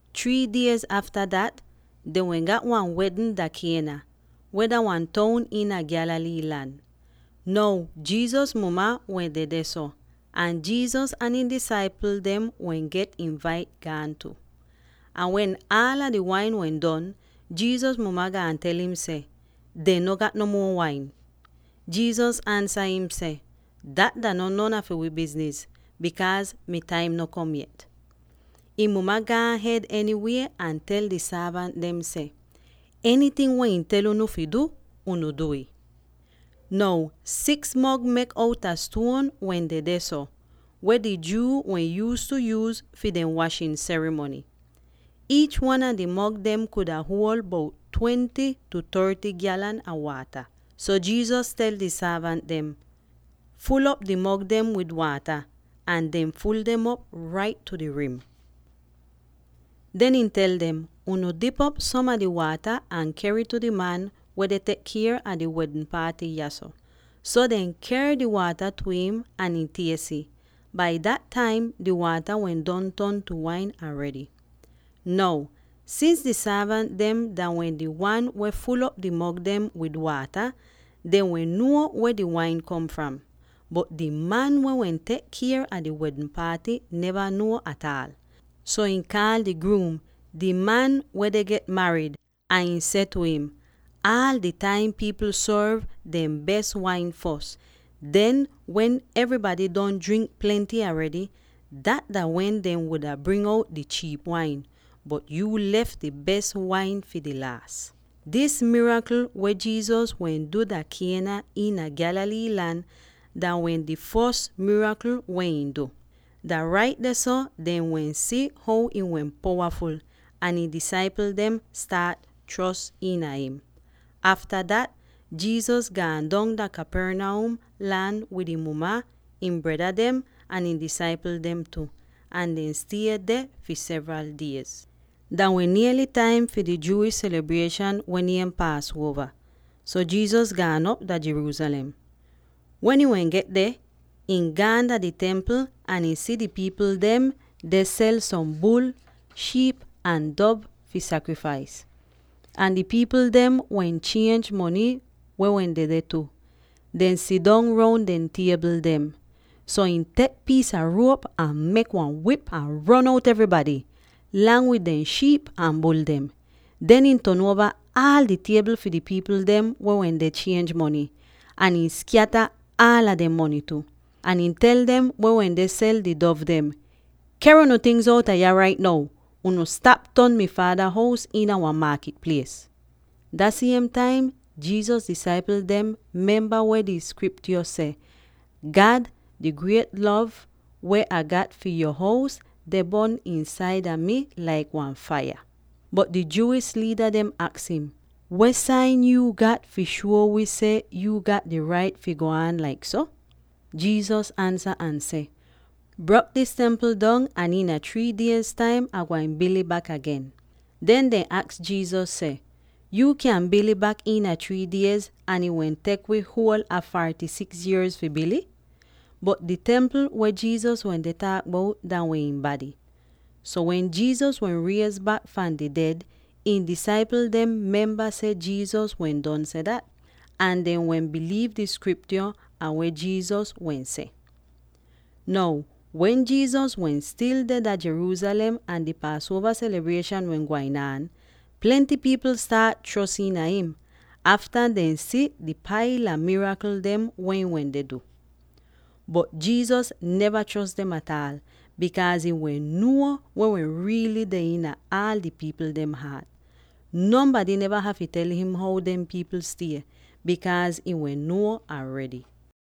Three diez afta dat, dehn wehn gat wan wedn dah Cana, weh dah wan toun iina Galilee lan. Now Jesus muma wehn dedeh so, ahn Jesus ahn ihn disaipl dem weh get invait gaan tu. Ahn wen aala di wain wehn don, Jesus muma gaan tel im seh, “Dehn no gat no muo wain.” Jesus ansa im seh, “Dat dah no non a fi wii bizniz; bikaaz mi taim no kom yet.” Ihn muma gaan ahed enywie ahn tel di sorvant dem seh, “Enyting weh ihn tel unu fi du, unu du'ih.” Now six mog mek outa stuon wehn dedeh so, weh di Jew wehn yuuztu yuuz fi dehn washin serimony. Iich wan a di mog dem kuda huol bout twenty tu thirty gyalan a waata. So Jesus tel di sorvant dem, “Ful'op di mog dem wid waata.” Ahn dehn ful dem op rait tu di rim. Den ihn tel dem, “Unu dip op som a di waata ahn ker'ih tu di man weh deh tek kier a di wedn paaty yahso.” So dehn ker di waata tu im ahn ihn ties ih. Bai dat taim, di waata wehn don ton tu wain aredy. Now, sins di sorvant dah wehn di siem wan dem weh ful'op di mog dem wid waata, dehn wehn nuo weh di wain kom fram; bot di man weh wehn tek kier a di wedn paaty neva nuo ataal. So ihn kaal di gruum —di man weh deh get marid— ahn ihn seh tu im, “Aal di taim pipl sorv dehn bes wain fos; den wen evrybady don jrink plenty aredy, dat dah wen dehn wuda bring out di chiip wain. Bot yuu lef di bes wain fi di laas!” Dis mirakl, weh Jesus wehn du dah Cana iina Galilee lan, dah wehn di fos mirakl weh ihn du. Dah rait dehso dehn wehn si how ihn wehn powaful, ahn ihn disaipl dem staat chros iina im. Afta dat, Jesus gaan dong dah Capernaum, lang wid ihn muma, ihn breda dem ahn ihn disaipl dem tu, ahn dehn stie deh fi sevral diez. Dah wehn niely taim fi di Jewish selibrieshan weh niem Paasuova, so Jesus gaan op dah Jerusalem. Wen ihn wehn get deh, ihn gaan dah di Templ ahn ihn si di pipl dem deh sel som bul, shiip ahn dov fi sakrifais. Ahn di pipl dem weh chienj mony wehn dedeh tu, deh sidong roun di tiebl dem. So ihn tek piis a ruop ahn mek wan wip ahn ron out evrybady, lang wid dehn shiip ahn bul dem. Den ihn ton uova aal di tiebl fi di pipl dem weh wende chienj mony, ahn ihn skyata aal dehn mony tu. Ahn ihn tel dem weh wende sel di dov dem, “Ker unu tingz outa yah rait now! Unu stap ton mi Faada hous iina wan maakit plies!” Dah siem taim Jesus disaipl dem memba weh di Skriptyo seh, “God! Di griet lov weh Ah gat fi yo hous deh bon iinsaida mi laik wan faiya.” Bot di Jewish liida dem aks im, “Weh sain yuu gat fi shuo wii seh yuu gat di rait fi go aan laik so?” Jesus ansa ahn seh, “Brok dis templ dong ahn iina three diez taim, Ah gwain bil'ih bak agen.” Den dehn aks Jesus seh, “Yuu kyan bil'ih bak iina three diez ahn ih wehn tek wii huol a forty-six yierz fi bil'ih?” Bot di templ weh Jesus wende taak bout dah wehn ihn bady. So wen Jesus wehn riez bak fahn di ded, ihn disaipl dem memba seh Jesus wehn don seh dat. Ahn dehn wehn biliiv di Skriptyo ahn weh Jesus wehn seh. Now wen Jesus wehn stil deh dah Jerusalem ahn di Paasuova selibrieshan wehn gwain aan, plenty pipl staat chros iina him, afta dehn si di paila mirakl dem weh ihn wende du. Bot Jesus neva chros dem ataal, bikaaz ihn wehn nuo weh wehn riily deh iin aal di pipl dehn haat. Nonbady neva hafy tel him how dem pipl stie, bikaaz ihn wehn nuo aredy.